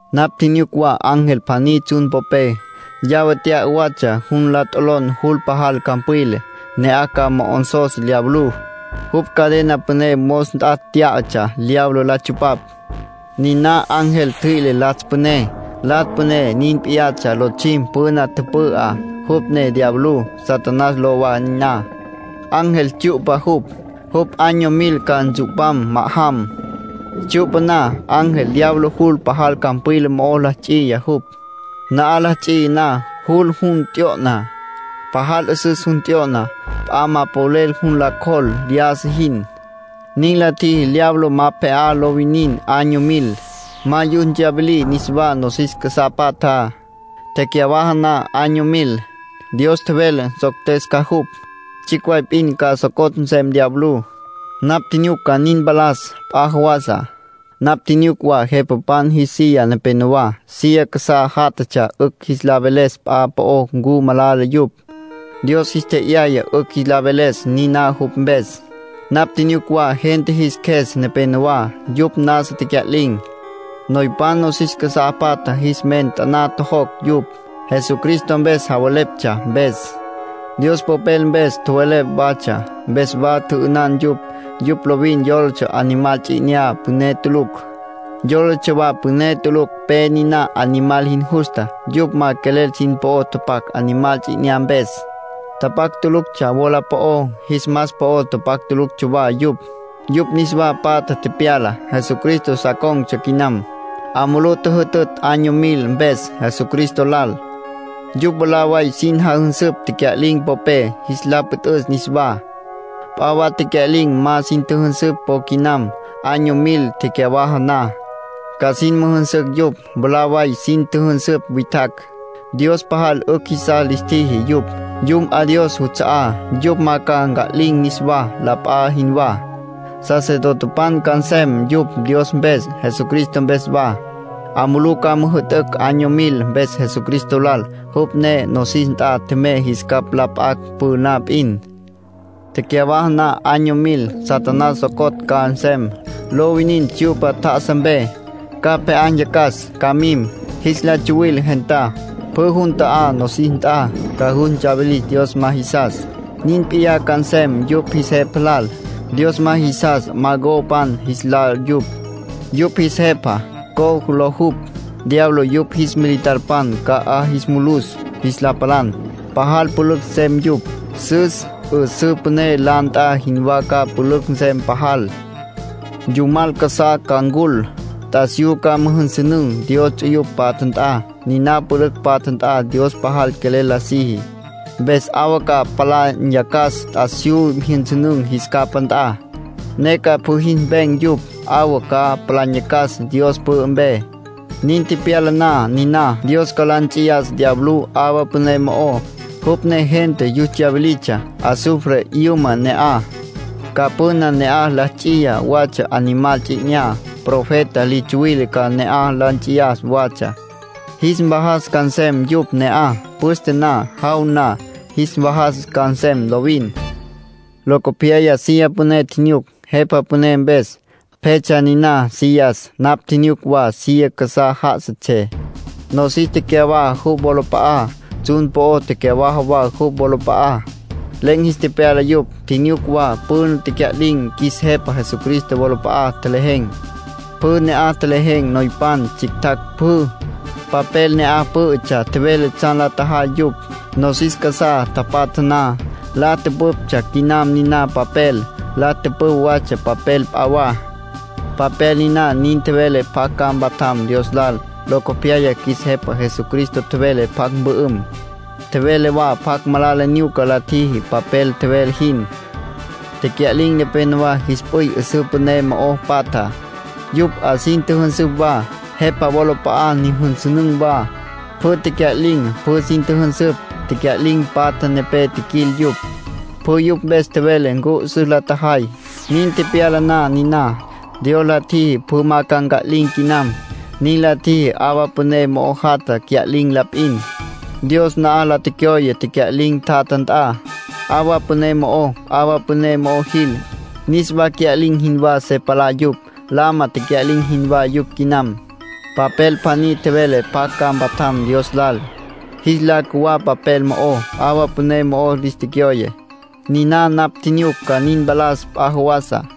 Napj tjinyuc wa ángel pjaní tsjun popé. Llave tya'a watsja jun la t'olon jul pajal campwila. Ne'aj ca mo'onsos diablú. Jupj cadena püné mos nt'a tyá'atsja diablo la tsupapj. Niná ángel ntjüi'le Latsj Püné. Latsj Püné nin p'iyatsja lotsjim püna tüpü'á. Jupj ne diablú. Satanás ló wa niná. Ángel tsyu'pa jupj, jupj año mil ca ntsu'pam ma'ajam. Tsyu'pa na, ángel diablo jul pajal campwila mo'ó la ts'iya jupj. Na'aj la ts'iya na, jul jun t'yo'na. Pajal 'üsüs jun t'yo'na, p'a ma polel jun la cjol lyájasa jin. Nin la tjiji diablo ma pje'á lo winin año mil, ma yus tsyawilí niswá nosis casá patjá. Tecyawaja na año mil, Dios tjevele nsoctes ca jupj. Tsjicj way p'in ca socotj nsem diablú. Napj tjinyuc ca nin mpalas p'a jawasa. Napj tjinyuc wa jepapan jis silla nepenowá. Silla casá jatjatsjé 'ücj jis la veles p'a po'ó ncu malala yupj. Dios jis tje'yaya 'ücj jis la veles niná jupj mpes. Napj tjinyuc wa gente jis qjues nepenowá. Yupj nasa tecya'lin̈. Noypan nosis casá patjá jis men taná tjojocj yupj, Jesucristo mpes javeleptsja mpes. Dios Popel mpes tjowelepj watsja, mpes wa tjü'ünan yupj. Yupj lovin yólatsja Animal Ts'i 'Inyá püné tulucj. Yólatsja wa püné tulucj pe niná Animal jin justa. Yupj ma quelel sin po'o tapac Animal Ts'i 'Inyá mpes. Tapac tuluctsja wola po'ó, jis mas po'ó tapac tuluctsja wa yupj. Yupj niswa patja tepyala. Jesucristo sa con̈tsja quinam. 'A mulú tjüjütütj año mil mpes, Jesucristo lal. Yupj mwalá way sin jajünsüpj tecya'lin̈ popé, jis la püt'üs niswá. P'a wa tecya'lin̈ ma sin tjüjünsüpj po quinam. Año mil tecyawaja na, ca sin müjünsücj yupj. Mwalá way sin tjüjünsüpj witjacj, Dios pajal 'ücj jisas lis tjiji yupj. Yum 'a Dios juts'a'á. Yupj ma ca nca'lin̈ niswá, la p'a jinwá. Sacerdotepan ca nsem yupj Dios mpes, Jesucristo mpes wa. 'A mulú ca müjü'tücj año mil mpes Jesucristo lal, jupj ne nosis nt'a tjemey jis capj la p'acj püna p'in. Tecyawaja na año mil, Satanás socotj ca nsem, lo winin tsyu'pa tjá'asa mpe. Ca pje'á nyacas, ca mim, jis la tsuwil gentá, pjü jun ta'á nosis nt'a. Ca yus ntsawilis Dios ma jisas. Nin p'iyá ca nsem yupj jis jepa lal. (Dios ma jisas Magogpan jis lá yupj. Yupj jis jepa, Gog ló jupj.) Diablo yupj jis militarpan ca 'a jis mulus jis la palan. Pajal pülücj nsem yupj. Sus 'üsǘ püné la nt'a jinwá ca pülücj nsem pajal. Yumal casá ca ncul. T'asiyú ca müjünsünün̈ Dios ts'uyupj patja nt'a. Niná pülücj patja nt'a Dios pajal quelel la siji. Mpes 'awa ca palá nyacas t'asiyú jyünsünün̈ jis capá nt'a, ne ca pjü jis mpen̈ yupj. 'Awa ca palá nyacas Dios pü'ü mpe. Nin tepyala na niná, Dios ca la nts'iyas diablú 'awa püné mo'ó, jupj ne gente yus tsyawilitsja. Azufre 'yüma ne'aj. Ca püna ne'aj la ts'iya watsja Animal Ts'i 'Inyá. Profeta li tsuwile ca ne'aj la ts'iya watsja. Jis mvajas ca nsem yupj ne'aj. Püste na, jaw na, jis mvajas ca nsem lovin. Locopyaya silla püné tjinyuc, Jepa Püné mpes. Pjetsja niná sillas. Napj tjinyuc wa silla casá ja'asatsjé. Nosis tecyawaja jupj wolap'a'á, tsjun po'ó tecyawaja wa jupj wolap'a'á. Len̈ jis tepyala yupj. Tjinyuc wa püna tecya'lin̈ qjuis Jepa Jesucristo wolap'a'a tjelejen̈. Pjü ne'aj tjelejen̈, noypan, tsjictjacj, pjü. Papel ne'aj pǘ'ütsja tjevele tsjan la tjajay yupj, nosis casá tapatja na. La tüpüptsja quinam niná papel. La tüpüpj watsja papel p'a wa. Papel niná nin tjevele pjacj ca mpatjam Dios lal. Locopyaya qjuis Jepa Jesucristo tjevele pjacj mpü'üm, tjevele wa pjacj malala nyuca la tjiji, papel tjevele jin. Tecya'lin̈ nepenowá jis p'üy 'üsǘ püné mo'o patja; yupj 'a sin tjüjünsüpj wa, Jepa wolap'a'a nyüjünsünün̈ wa. Pjü tecya'lin̈, pjü sin tjüjünsüpj. Tecya'lin̈ patja nepé tjiquil yupj. Pjü yupj mpes tjevele ncu 'üsüs la tjajay. Nin tepyala na niná, Dios la tjiji pjü ma ca nca'lin̈ quinam. Nin la tjiji 'awa püné mo'o jatja cya'lin̈ la p'in. Dios na'aj la tecyoye tecya'lin̈ tjatja nt'a, 'awa püné mo'ó. 'Awa püné mo'o jil, niswa cya'lin̈ jinwá se palá yupj. Lama tecya'lin̈ jinwá yupj quinam. Papel pjaní tjevele pjacj ca mpatjam Dios lal. Jis lá cjuwá papel mo'ó, 'awa püné mo'o lis tecyoye. Niná napj tjinyuc ca nin mpalas p'a jawasa.